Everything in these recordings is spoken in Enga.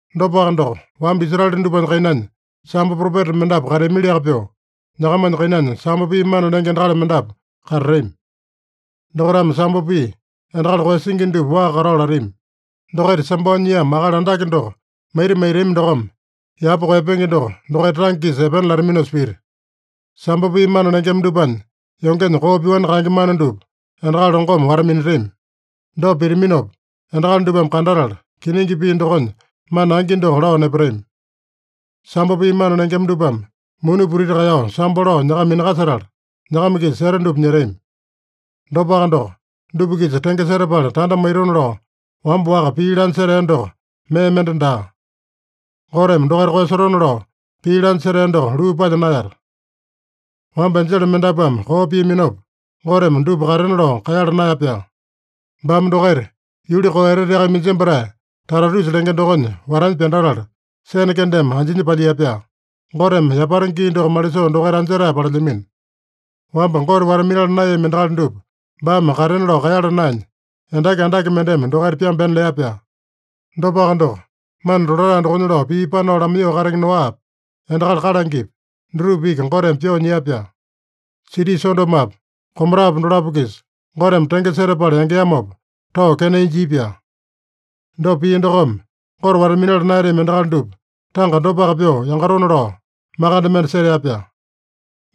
Dopaka doko, wamba Israele dupanya kainanya sambo propeta mendapu kateamiliaka pyoo, nyakamanya kainanya sambo pii mana lenge endakali mendapu katatami. Dokaitame sambo pii, endakali koeyasingi dupa waa katao latami. Dokaita sambao nyiamo Akali Andake doko maita maitami dokome, yapa koeyapenge doko dokaita tange-kisa epena lataminosa pita. Sambo pii mana lengema dupanya yongenya koo pyoani kaenge mana dupa endakali longome wata-minatami. Dopa pitaminopa, endakali dupame kandatala, kiningi pii dokonya mana angi doko lao nepatami. Sambo pii mana lengema dupame muni putiti kaeyao sambo lao nyakama minakasetala, nyakama-kisa seta dupa nyetami. Dopaka doko, dupa-kisa tenge setapala tanda maitona lao wamba-waka pii lanya setea doko mee mende daa. Goteme dokaita koeyasotona lao pii lanya setea doko luu palya naeyata. Wamba enjele mendapuame koo piaminopa, Goteme dupa katena lao kaeyala naeya-pyaa. Baame dokaita yuli koo eteteaka iminjembatae Tatarusa lenge dokonya watanya pyandatala, sene kendeme anjinya palyia-pyaa. Goteme yapata gii doko malisoo dokaita anjetae palelyamino. Wamba Gote wata-minala naeyami endakali dupa baame katena lao kaeyala naenya, endaki andake mendeme dokaita pyambena lea-pyaa. Dopaka doko, mana tolatae dokonya lao pii panao lamaiyoo katenge Noapi, endakali kalangepi, dutupa iki Goteme pyoo nyia-pyaa. Siti Sodomopa, Gomorapa dolapo-kisa Goteme tenge setapala yangeamopa, tao kenai jia-pyaa. Dopa pia dokome, Gote wata-minala naeyatami endakali dupa tanga dopaka pyoo yangatona lao makande mende setea-pyaa.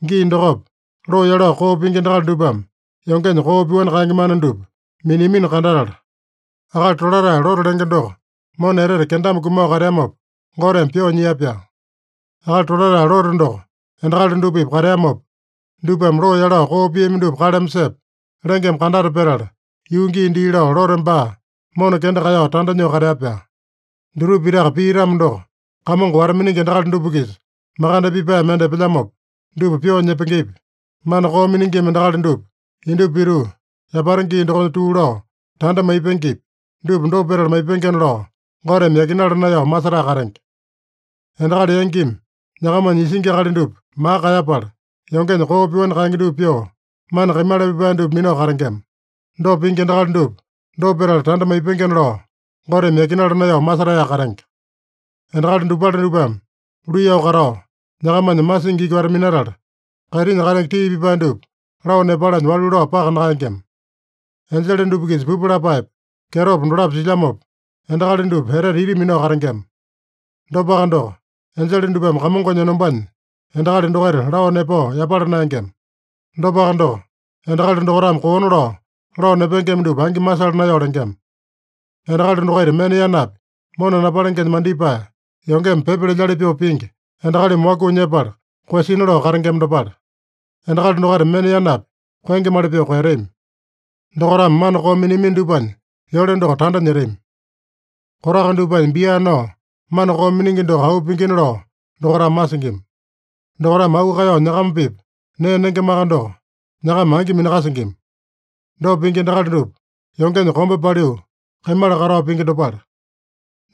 Gii dokopa, loo yalao koo pingi endakali dupame yongenya koo pyoani kaenge mana dupa miniamino kandatala, akali tolatae Lote lenge doko mona etete kendame kumao kateamopa, Goteme pyoo nyia-pyaa. (Akali tolatae Lote doko endakali dupa-pipa kateamopa, dupame loo yalao koo piami dupa kaleme sepa, lengeme kandata petala, yuu gii dii lao Lote baa mona kenda kaeyao tanda nyoo katea-pyaa.) Dutupa pitaka pia-tamo doko, Kamongo wata-miningi endakali dupa-kisa makande pipae mende epelyamopa, dupa pyoo nyepengepi, mana koo miningima endakali dupa indupa pituu, yapata gii dokonya tuu lao, tanda maipengepi, dupa dopa petala maipengena lao Goteme yakinala naeyao masetae katenge. Endakali yangimi nyakamanya isingi akali dupa maka kaeyapala, yongenya koo pyoani kaenge dupa pyoo, mana kaimala pipae dupa minao katengema. Dopa pingi endakali dupa, dopa petala tanda maipengena lao, Goteme yakinala naeyao masetaeyaka katenge. Endakali dopale dupame luiyao katao, nyakamanya masingi iki wata-minatala, kaitinya katenge tii pipae dupa lao nepalanya walu lao paka nakaengema. Enjele dupa-kisa pupu lapaepa, kyetopa dolapo silyamopa, endakali dupa etete ita minao katengema. Dopaka doko, enjele dupame Kamongonya enombanya endakali dokaita lao nepao yapala naengema. Dopaka doko, endakali dokaitame koona lao, lao nepengema dupa angi masala naeyao lengema. Endakali dokaita mena yanapi mona napalengenya mandipae, yongeme pyepa lelyali pyoo pingi, endakalimi wakuu nyepala koeyasina lao katengema dopale. Endakali dokaita mena yanapi koengemali pyoo koeyatami. Dokaitame mana koo miniamino dupanya yole doko tanda nyetami. Kotaka dupanya bia nao mana koo miningi doko auu pingina lao dokaitame masingima. Dokaitame auu kaeyao nyakama-pipa nee nengemaka doko, nyakama angi minakasingima. Dopa pingi endakali dupa, yongenya kombe paliu kaimala katao pingi dopale.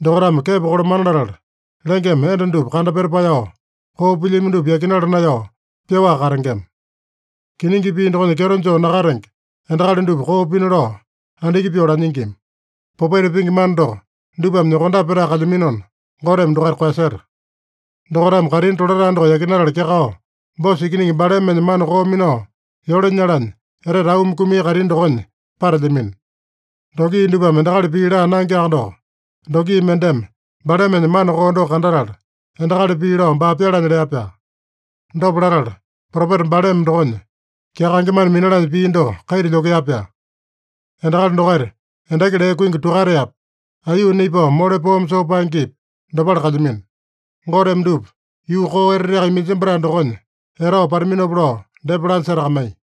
Dokaitame kepo kolamana latala, lengeme enda dupa kandapeta paeyao, koo pilyami dupa yakinala naeyao pyoaka katengema. Kiningi pii dokonya kyeto joo nakatenge endakali dupa koo pina lao andiki pyoo lanyingima. Popaita pingi mana doko dupame nyokondape petae kalyaminona, Goteme dokaita koeyaseta. Dokaitame kaitini tolatae doko yakinatala kyakao, Boso ikiningi Balamenya mana koo minao yole nyalanya, etete auumi kumia kaitini dokonya patelyamino. Dongi dupame endakali pii laa naengeaka doko, dongi mendeme Balamenya mana koo doko kandatala, endakali pii lao baa pyalanya lea-pyaa. Dopa latala, propeta Balame dokonya kyakaenge mana minalanya pia doko kaita lyokea-pyaa. Endakali dokaita endaki lee kuingi tukataepi, aiyuu naipao mole poome soo paengepi, dopale kalyamino. Goteme dupa yuu koo eteteaka iminjembatae dokonya etao pataminopa lao depa lanya setakamaiya.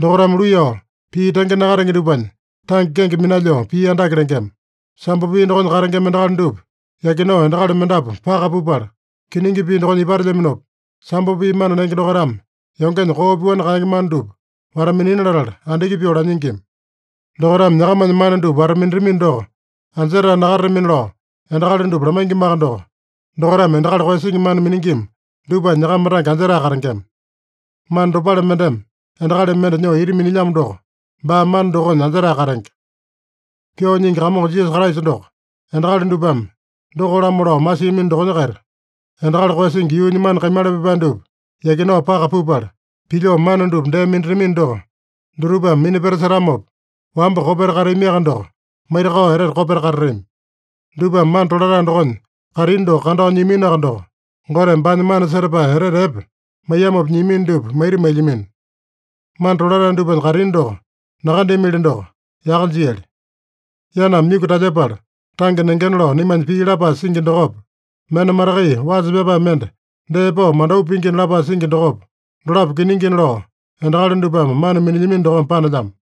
Dokaitame luiyao pii tenge nakatenge dupanya tange kenge minalyoo pii andake lengema. Sambo pii dokonya katengema endakali dupa yakinao endakali mendapu paka pupala, kiningi pii dokonya ipatelyaminopa, sambo pii mana lenge dokaitame yongenya koo pyoani kaenge mana dupa wata-minina latala, andiki pyoo lanyingima. Dokaitame nyakamanya mana dupa wata-minatamino doko, anjetae nakatatamina lao endakali dupa lamaingimaka doko, dokaitame endakali koeyasingi mana miningima dupanya nyakama tange anjetae katengema. Mana dopale mendeme endakali mende nyoo ita minilyamo doko, baa mana dokonya anjetae katenge. Pyoo Nyingi Kamongo Jisasa Kraisa doko endakali dupame doko-lamo lao masiamino dokonya-kaita, endakali koeyasingi yuunya mana kaimala pipae dupa yakinao paka pupala, pilyoo mana dupa dee minatamino doko, dutupame minapeta setamopa, wamba kopeta kateaminoaka doko, maitakao etete kopeta katatami. Dupame mana tolatae dokonya kaitini doko kandao nyiaminoaka doko, Goteme baanya mana setapae etete epe maiyamopa nyiamino dupa maita mailyamino. Mana tolatae dupanya kaitini doko nakandeamili doko, yaka jiali. “Yaname myuku talyepala tange nengena” lao naimanya pii lapae singi dokopa, “Mena matakai wasa pyapae mende dee pao mandau pingina” lapae singi dokopa, dolapo kiningina lao endakali dupame mana minilyamino dokome panelyamo.